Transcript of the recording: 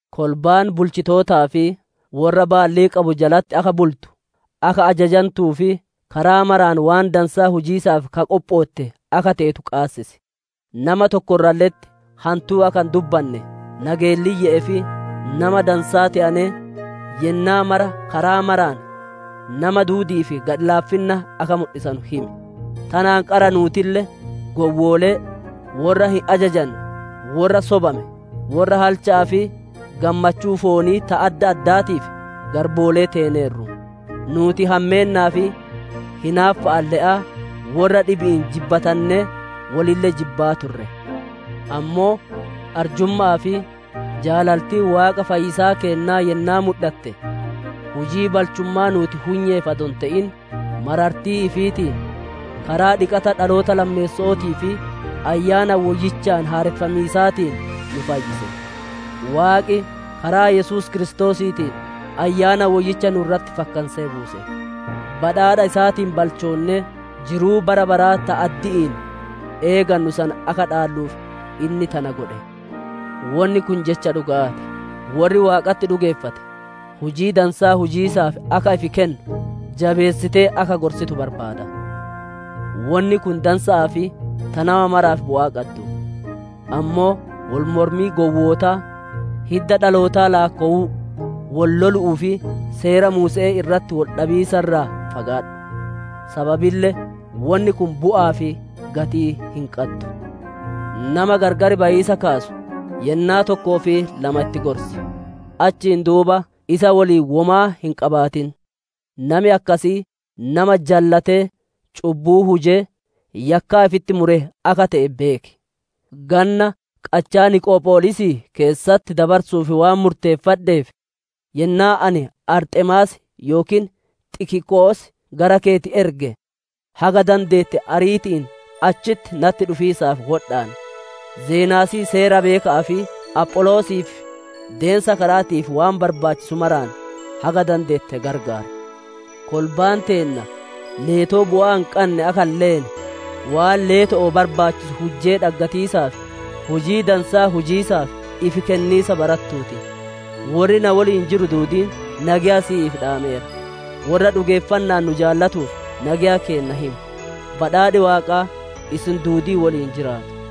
Kolbaan bulchitootaa fi worra baallii qabu jalatti akka bultu, akka ajajantuu fi karaa maraan waan dansaa hujiisaaf ta qophootte akka teetu qaabachiis. Nama tokko irralle'etti hantuu akka hin dubbanne, nageelliyye'ee fi nama dansaa te'anee, yennaa mara karaa maraan nama duudi'iif gadhi-laafinna akka mudhisanu himi. Tanaan qara nuutille gowwoolee, worra hin ajajanne, worra sobame, worra halcha'aa fi gammachuu foonii ta adda addaatiif garboolee teeneerru. Nuuti hammeennaa fi hinaaffa'aan le'aa, worra dhibi'iin jibbatannee wolille jibbaa turre. Ammoo arjumma'aa fi jaalaltiin Waaqa fayyisaa keennaa yennaa mudhatte, hujii balchummaa nuuti hunyeef adoo hin te'in, marartii ifiitiin, karaa dhiqata dhaloota lammeesso'ootii fi Ayyaana Woyyichaan haareffamiisaatiin nu fayyise. Waaqi karaa Yesuus Kiristoosiitiin Ayyaana Woyyicha nu irratti fakkansee buuse. Badhaadha isaatiin balchoonnee, jiruu bara baraa ta addi'iin eegannu san akka dhaalluuf inni tana godhe. Wonni kun jecha dhuga'aa ti. Worri Waaqatti dhugeeffate hujii dansaa hujiisaaf akka ifi kennu, jabeessitee akka gorsitu barbaada; wonni kun dansa'aa fi ta nama maraaf bu'aa qaddu. Ammoo wol mormii gowwootaa, hidda dhalootaa laakkowuu, wol lolu'uu fi Seera Muuse'ee irratti wol dhabiisa irraa fagaadhu. Sababille wonni kun bu'aa fi gatii hin qaddu. Nama gargar bayiisa kaasu yennaa tokkoo fi lama itti gorsi, achiin duuba isa woliin womaa hin qabaatin. Nami akkasii, nama jallatee cubbuu hujee, yakkaa ifitti mure akka te'e beeki. Ganna qachaa Niqopholiisii keessatti dabarsu'uuf waan murteeffadheef, yennaa ani Arxemaas yookiin Xikiqoos gara keeti erge, haga dandeette ariiti'iin achitti natti dhufiisaaf wodhaan. Zenaasii seera beeka'aa fi Apholoosiif, deensa kara'aatii waan barbaachisu maraan haga dandeette gargaar. Kolbaan teenna leetoo bu'aa hin qanne akka hin leene, waan leeto'oo barbaachisu hujjee dhaggatiisaaf, hujii dansaa hujiisaaf ifi kenniisa barattuu ti. Worri na woliin jiru duudiin nageya siif dhaameera. Worra dhugeeffanna'aan nu jaalatuuf nageya keenna himi. Badhaadhi Waaqaa isin duudii woliin jiraatu.